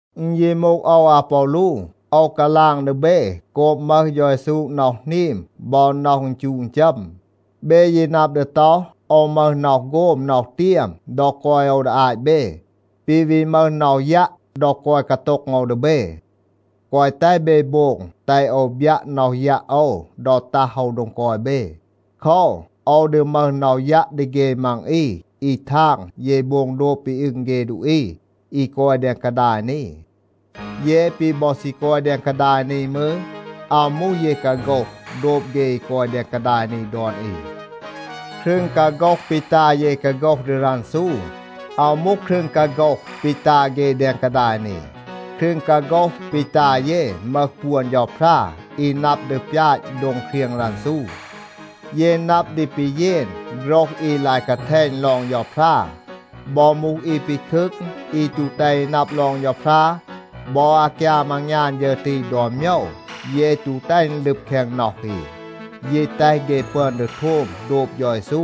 อึณ ยี มูห โอว อาปอลู, โอว กาลาง ดี เบ โกบ มึห เฌา เยซู น็อห หนีม บอ น็อห อึณจูะ อึณจัม. เบ ยี นับ ดี ต็อห, โอว มึห น็อห โฆม น็อห เตียม ดอ กอย โอว ดี อาต เบ, ปี วี มึห น็อห ยัะ ดอ กอย กาโต็ง โอว ดี เบ. แกวะ แตห เบ โบง แตห โอว บยัะ น็อห ยัะ โอว ดอ ตัห โอว โดง กอย เบ. โคว, โอว ดี มึห น็อห ยัะ ดี เฆ มัง อี อี ทาง เย โบง โดบ ปี อึง เฆ ดูอี อี กอย แดง กาดาย นี. เย ปี บอ ซี กอย แดง กาดาย นี มืร, อาว มูห เย กาโฆห โดบ เฆ อี กอย แดง กาดาย นี ดอน อี. ครึง กาโฆห ปี ตา เย กาโฆห ดี รันซู, อาว มูห ครึง กาโฆห ปี ตา เฆ แดง กาดาย นี. ครึง กาโฆห ปี ตา เย มึห ปวน เฌาพรา อี นับ ดี ปยาต โดง เครียง รันซู. เย นับ ดี ปีเยน โฆรห อี ลาย กาแทณ ลอง เฌาพรา. บอ มูห อี ปีคึก, อี ตู แตห อี นับ ลอง เฌาพรา, บอ อากยาม อางยาน ฌึร ตี ดอน โมยว, เย ตู แตห อึณ ลึบ แคง น็อห อี, ยี แตห เฆ ปึอน ดี โทม โดบ เฌา เยซู.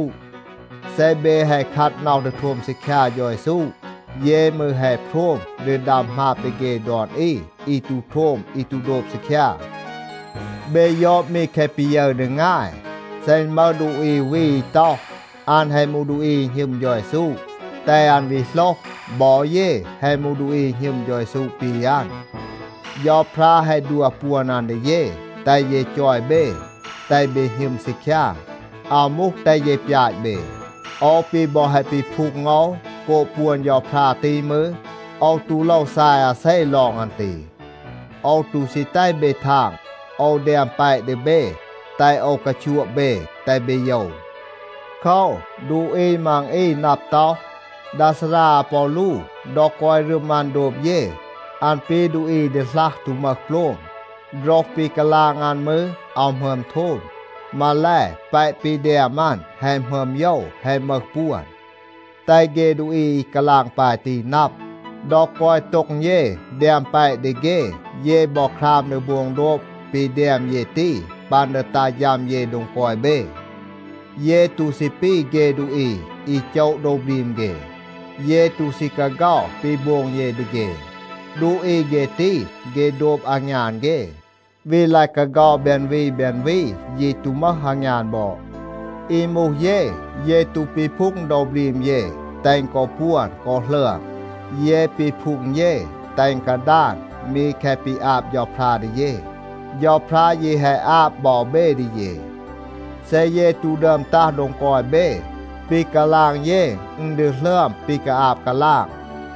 เซ เบ แฮะ คัด น็อห ดี โทม ซีคยา เฌา เยซู, เย มืร แฮะ โพรม ดี ดัม หมาบ ดี เฆ ดอน อี อี ตู โทม อี ตู โดบ ซีคยา. เบ ยอด มี แคะ ปี ยึร ดี งาย. เซ อึณ มึห ดูอี อู วี อี ต็อห, อัน แฮะ มูห ดูอี อี หณึม เฌา เยซู, แตห อัน วี โหลห, บอ เย แฮะ มูห ดูอี อี หณึม เฌา เยซู ปี อัน. เฌาพรา แฮะ ดัว ปวน อัน ดี เย, แตห เย จอย เบ, แตห เบ หณึม ซีคยา, อาว มูห แตห เย ปยาต เบ. โอว ปี บอ แฮะ ปีพูง โอว โกบ ปวน เฌาพรา ตี มืร, โอว ตู โลว ซาย อาเซ ลอง อัน ตี. โอว ตู ซี แตห เบ ทาง, โอว แดม แปะ ดี เบ, แตห โอว กาชัวะ เบ, แตห เบ โยว. โคว, ดูอี มัง อี นับ ต็อห, “ดา ซารา อาปอลู, ดอ กอย รึม อัน โดบ เย, อัน ปี ดูอี ดีหลัห ตู มึห โปลม. โฆรห ปี กาลาง อัน มืร, อาว หมึอม โทม. มาแล, แปะ ปี แดม อัน แฮะ หมึอม โยว, แฮะ มึห ปวน.” แตห เฆ ดูอี อี กาลาง ปาย ตี นับ, ดอ กอย โต็ง เย แดม แปะ ดี เฆ, เย บอ คราม ดี โบง โดบ ปี แดม เย ตี ปัน ดี ตัห ฌัม เย โดง กอย เบ. เย ตู ซี ปี เฆ ดูอี อี โจะ โดว บรีม เฆ. เย ตู ซี กาเฆา ปี โบง เย ดี เฆ. ดูอี เฆ ตี, เฆ โดบ อางยาน เฆ, วี ลาย กาเฆา แบน วี แบน วี, ยี ตู มึห อางยาน บอด. อี มูห เย, เย ตู ปีพูง โดว บรีม เย แตห อึณ กอ ปวน กอ หลึอม. เย ปีพูง เย แตห อึณ กาดาน มี แคะ ปี อาบ เฌาพรา ดี เย. เฌาพรา ยี แฮะ อาบ บอ เบ ดี เย. เซ เย ตู ดึอม ตัห โดง กอย เบ, ปี กาลาง เย อึณ ดี หลึอม ปี กาอาบ กาลาง.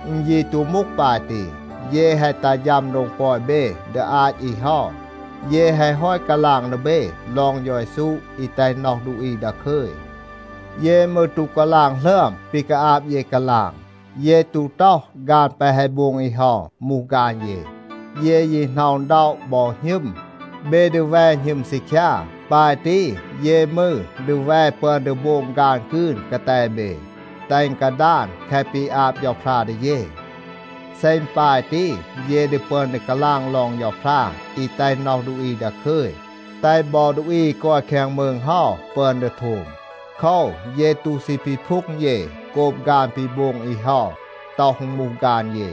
อึณ ยี ตู มูห ปาย ตี. เย แฮะ ตัห ฌัม โดง กอย เบ ดี อาต อี เฮา, เย แฮะ ฮอต กาลาง ดี เบ ลอง เฌา เยซู อี แตห น็อห ดูอี ดาคึย. เย มืร ตู กาลาง หลึอม ปี กาอาบ เย กาลาง. เย ตู ต็อห ฆาน แปะ แฮะ โบง อี เฮา มูห ฆาน เย. เย ยี หน็อะ อึณ ด็อะ บอ หณึม, เบ ดี แว หณึม ซีคยา. ปาย ตี, เย มืร ดี แว ปึอน ดี โบง ฆาน กืน กาแต เบ, แตห อึณ กาดาน แคะ ปี อาบ เฌาพรา ดี เย. เซ อึณ ปาย ตี, เย ดี ปึอน ดี กาลาง ลอง เฌาพรา อี แตห น็อห ดูอี ดาคึย, แตห บอ ดูอี อี กอย แคง มืง เฮา ปึอน ดี โทม. โคว, เย ตู ซี ปีพูง เย โกบ ฆาน ปี โบง อี เฮา, ต็อห อึณ มูห ฆาน เย.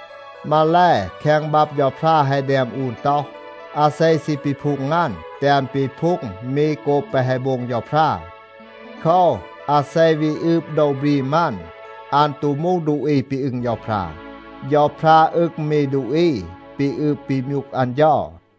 มาแล, แคง บับ เฌาพรา แฮะ แดม อูน ต็อห, “อาเซ ซี ปีพูง อัน, แตห อัน ปีพูง มี โกบ แปะ แฮะ โบง เฌาพรา.” โคว, อาเซ วี อืบ โดว บรีม อัน, อัน ตู มูห ดูอี ปี อึง เฌาพรา. เฌาพรา อึง มี ดูอี ปี อืบ ปี มยูก อัน เฌา.